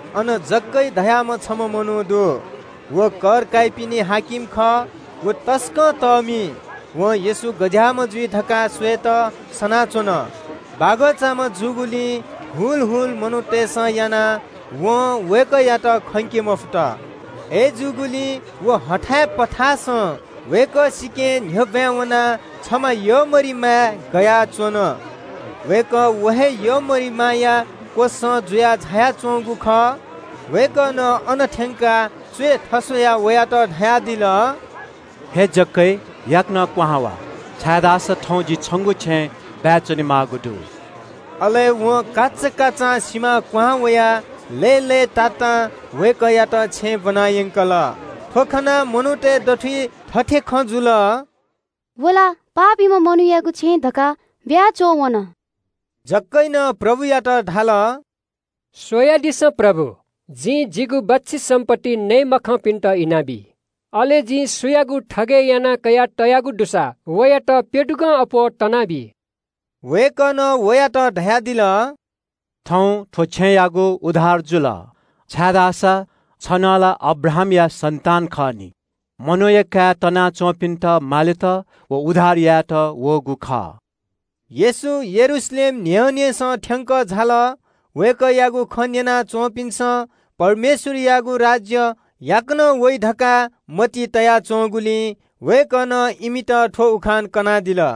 अन जखायस धाःम्‍ह छम्‍ह मनू दु। व कर काइपिनि हाकिम खः। व तसकं तःमि। वं येशू गज्‍याःम्‍ह जुइ धकाः स्‍वयेत सनाच्‍वन। बागःचाम्‍ह जूगुलिं ग्‍वाः ग्‍वाः मनूतय्‌सं यानाः वं वय्‌कःयात खंके मफुत। अय्‌जूगुलिं व हथाय् पथासं वय्‌कः स्‍वयाः न्‍ह्यः ब्‍वाँय् वनाः छमा यःमरिमाय् गयाच्‍वन। वय्‌कः व हे यःमरिमाया क्‍वसं जुयाः झायाच्‍वंगु खः। वय्‌कलं अन थ्‍यंकाः च्‍वय् थस्‍वयाः वयात धयादिल – “हे जखायस, याकनं क्‍वहां झासँ, छाय्‌धाःसा थौं जि छिगु छेँय् बाय् च्‍वनेमाःगु दु।” अले वं काचाकाचां सिमां क्‍वहां वयाः लय्‌लय्‌तातां वय्‌कःयात छेँय् ब्‍वनायंकल। थ्‍व खनाः मनूतय् दथुइ थथे खँ जुल – “व ला पापीम्‍ह मनूयागु छेँय् धकाः बाय् च्‍वंवन।” जखायसं प्रभुयात धाल – “स्‍वयादिसँ प्रभु, जिं जिगु बच्‍छि सम्‍पत्ति नये मखंपिन्‍त इनाबी। अले जिं सुयागुं थगय् यानाः कयातयागु दुसा, वयात प्‍यदुगं अप्‍वः तनाबी।” वय्‌कलं वयात धयादिल – “थौं थ्‍व छेँयागु उद्धार जुल, छाय्‌धाःसा छि नं ला अब्राहामया सन्‍तान खः नि। मनूया काय् तनाच्‍वंपिन्‍त मालेत व उद्धार यायेत वःगु खः।” येशू यरूशलेम न्‍ह्यःनेसं थ्‍यंकः झाल। वय्‌कःयागु खँ न्‍यना च्‍वंपिन्‍सं परमेश्‍वरयागु राज्‍य याकनं वइ धकाः मतिइ तया च्‍वंगुलिं वय्‌कलं इमित थ्‍व उखान कनादिल।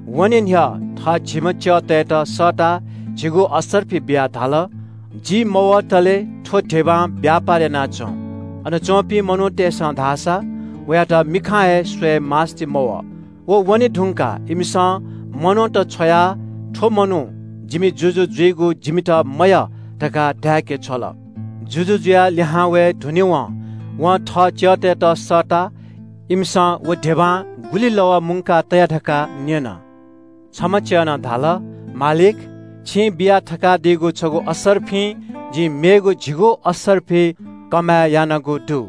वने न्‍ह्यः थः झिम्‍ह च्‍यःतय्‌त सःताः झिगू असर्फि बियाः धाल – ‘जि मवतले थ्‍व धिबां व्‍यापार याना च्‍वँ।’ अन च्‍वंपिं मनूतय्‌सं धाःसा वयात मिखां हे स्‍वयेमास्‍ति मवः। व वने धुंकाः इमिसं मनूत छ्वयाः ‘थ्‍व मनू जिमि जुजु जुइगु जिमित मयः’ धकाः धाय्‌के छ्वल। “जुजु जुयाः लिहां वये धुनेवं वं थः च्‍यःतय्‌त सःताः इमिसं व धिबां गुलि कमय् यानाः तया धकाः न्‍यन। न्‍हापांम्‍ह च्‍यलं धाल – ‘मालिक, छिं बिया थकादीगु छगू असर्फिं जिं मेगु झिगू असर्फि कमय् यानागु दु।’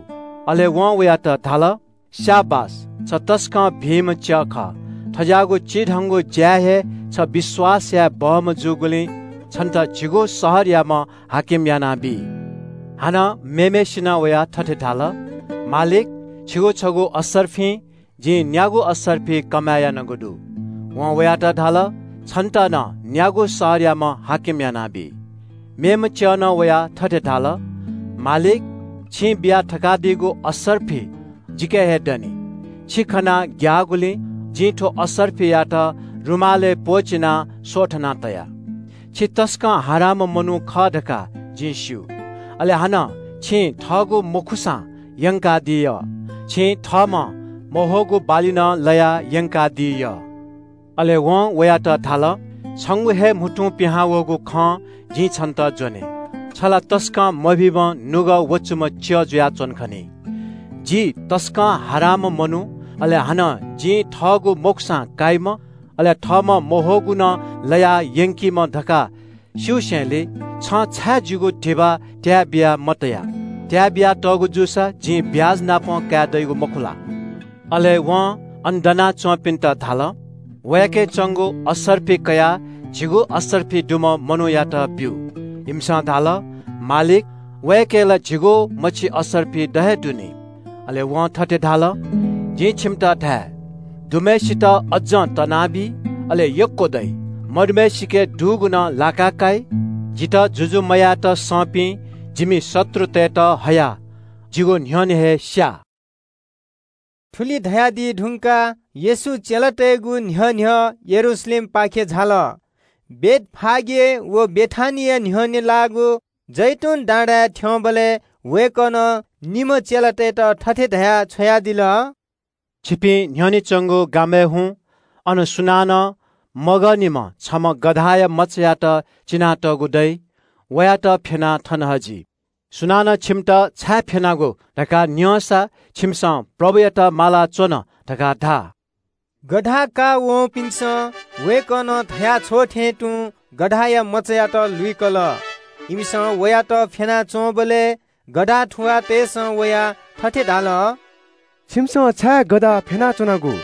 “अले वं वयात धाल – ‘स्‍याबास, छ तसकं भिंम्‍ह च्‍यः खः। थज्‍याःगु चिधंगु ज्‍याय् हे छ विश्‍वास याये बहःम्‍ह जूगुलिं छन्‍त झिगू शहरयाम्‍ह हाकिम यानाबी।’ “हानं निम्‍हम्‍हय्‌सिनं वयाः थथे धाल – ‘मालिक, छिगु छगू असर्फिं जिं न्‍यागू असर्फि कमय् यानागु दु।’ “वं वयात धाल – ‘छन्‍त नं न्‍यागू शहरयाम्‍ह हाकिम यानाबी।’ “मेम्‍ह च्‍यलं वयाः थथे धाल – ‘मालिक, छिं बिया थकादीगु असर्फि जिके हे दनि। छि खनाः ग्‍याःगुलिं जिं थ्‍व असर्फियात रुमालय् प्‍वःचिनाः स्‍वथना तया। छि तसकं हारांम्‍ह मनू खः धकाः जिं स्‍यू, अले हानं छिं थःगु मखुसां यंकादी यः। छिं थःम्‍हं मह्वःगु बाली नं लयाः यंकादी यः।’ “अले वं वयात धाल – ‘छंगु हे म्‍हुतुं पिहां वःगु खं जिं छन्‍त ज्‍वने, छ ला तसकं मभिंम्‍ह च्‍यः जुयाच्‍वन खनी। जि तसकं हारांम्‍ह मनू, अले हानं जि थःगु मखुसां काइम्‍ह, अले थःम्‍हं मह्वःगु नं लयाः यंकीम्‍ह धकाः स्‍यूसेलिं छं छाय् जिगु धिबा त्‍याय् बिया मतया? त्‍याय् बियातःगु जूसा जिं ब्‍याजनापं काये दइगु मखु ला?’ “अले वं अन दनाच्‍वंपिन्‍त धाल – ‘वयाके च्‍वंगु असर्फि कयाः झिगू असर्फि दुम्‍ह मनूयात ब्‍यु।’ “इमिसं धाल – ‘मालिक, वयाके ला झिगू मछि असर्फि द हे दु नि।’ “अले जुजुं थथे धाल – जिं छिमित धाये – ‘दुम्‍हय्‌सित अज्‍जं तनाबी, अले यक्‍व दइ। मदुम्‍हय्‌सिके दुगु नं लाका काइ। जितः जुजु मयायेत संपिं जिमि शत्रुतय्‌त हयाः जिगु न्‍ह्यःने हे स्‍या।’” थुलि धयादी धुंकाः येशू चेलातय्‌गु न्‍ह्यः न्‍ह्यः यरूशलेमपाखे झाल। बेथफागे व बेथानिया न्‍ह्यःने लाःगु जैतून डाँडाय् थ्‍यंबलय् वय्‌कलं निम्‍ह चेलातय्‌त थथे धयाः छ्वयादिल – “छिपिं न्‍ह्यःने च्‍वंगु गामय् हुँ। अन सुनानं मगःनिम्‍ह छम्‍ह गधाया मचायात चिनातःगु दइ। वयात फ्‍यनाः थन हजि। सुनानं छिमित ‘छाय् फ्‍यनागु?’ धकाः न्‍यंसा छिमिसं ‘प्रभुयात माःगु दु’ धकाः धा।” गधा काःवंपिन्‍सं वय्‌कलं धया छ्वःथें तुं गधाया मचायात लुइकल। इमिसं वयात फ्‍यना च्‍वंबलय् गधा थुवाःतय्‌सं वयाः थथे धाल – “छिमिसं छाय् गधा फ्‍यनाच्‍वनागु?”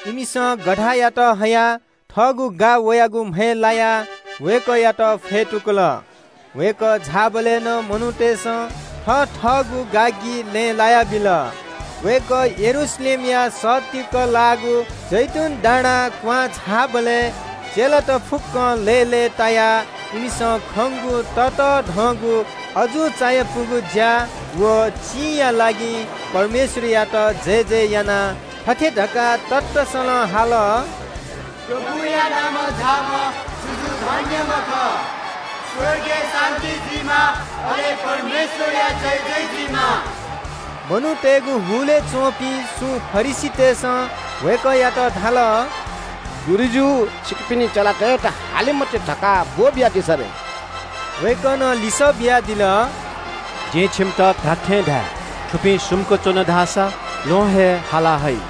इमिसं गधायात हयाः थःगु गा वयागु म्‍हय् लायाः वय्‌कःयात फ्‍यतुकल। वय्‌कः झाःबलय् नं मनूतय्‌सं थथःगु गागि लँय् लायाबिल। वय्‌कः यरूशलेमया सत्तीक लाःगु जैतून डाँडां क्‍वहां झाःबलय् चेलात फुक्‍कं लय्‌लय्‌तायाः इमिसं खंगु ततःधंगु अजू चायापुगु ज्‍या व चिंया लागि परमेश्‍वरयात जयजय यानाः थथे धकाः ततःसलं हाल – “परमप्रभुया नामं झाःम्‍ह जुजु धन्‍यम्‍ह खः। स्‍वर्गय् शान्‍ति जुइमा, अले परमेश्‍वरया जयजय जुइमा।” मनूतय्‌गु हुलय् च्‍वंपिं सुं फरिसीतय्‌सं वय्‌कःयात धाल – “गुरुजु, छिकपिनि चेलातय्‌त हाले मते धकाः ब्‍वःबियादिसँ रे।” वय्‌कलं लिसः बियादिल – “जिं छिकपिन्‍त धात्‍थें धाये – थुपिं सुम्‍क च्‍वन धाःसा ल्‍वहं हे हाला हइ।”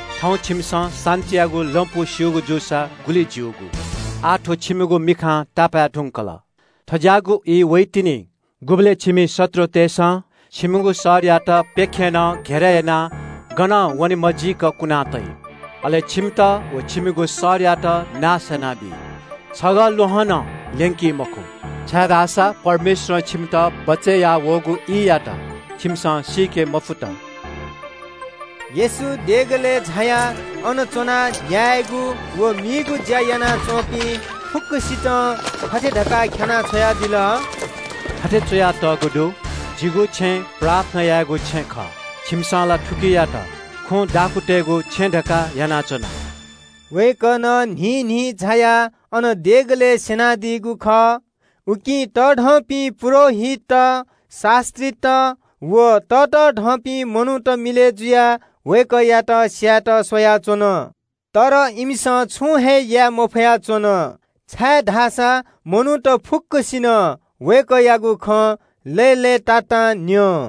“थौं छिमिसं शान्‍तियागु लँपु स्‍यूगु जूसा गुलि ज्‍यूगु। आः थ्‍व छिमिगु मिखां तापाय् धुंकल। थज्‍याःगु ई वइतिनि गुबलय् छिमि शत्रुतय्‌सं छिमिगु शहरयात प्‍यखेरं घेरय् यानाः गनं वने मजीक कुना तइ। अले मस्‍तनापं छिमित व छिमिगु शहरयात भज्‍यंक नाश यानाबी। छगः ल्‍वहंया द्यःने मेगु ल्‍वहं नं ल्‍यंका तइ मखु, छाय्‌धाःसा परमेश्‍वरं छिमित बचय् याः वःगु ईयात छिमिसं सीके मफुत।” येशू देगलय् झायाः अन च्‍वनाः न्‍यायेगु व मीगु ज्‍या यानाच्‍वंपिं फुक्‍कसितं थथे धकाः ख्‍यानाः छ्वयादिल – “थथे च्‍वयातःगु दु – ‘जिगु छेँ प्रार्थना यायेगु छेँ खः।’ छिमिसं ला थुकियात खुँ दाखुँतय्‌गु छेँ धकाः यानाच्‍वन।” वय्‌कलं न्‍हिन्‍हिं झायाः अन देगलय् स्‍यनादीगु खः। उकिं तःधंपिं पुजाहारीत, शास्‍त्रीत व ततःधंपिं मनूत मिलय् जुयाः वय्‌कःयात स्‍यायेत स्‍वयाच्‍वन। अय्‌नं इमिसं छुं हे याये मफया च्‍वन, छाय्‌धाःसा मनूत फुक्‍कसिनं वय्‌कःयागु खँ लय्‌लय्‌तातां न्‍यं।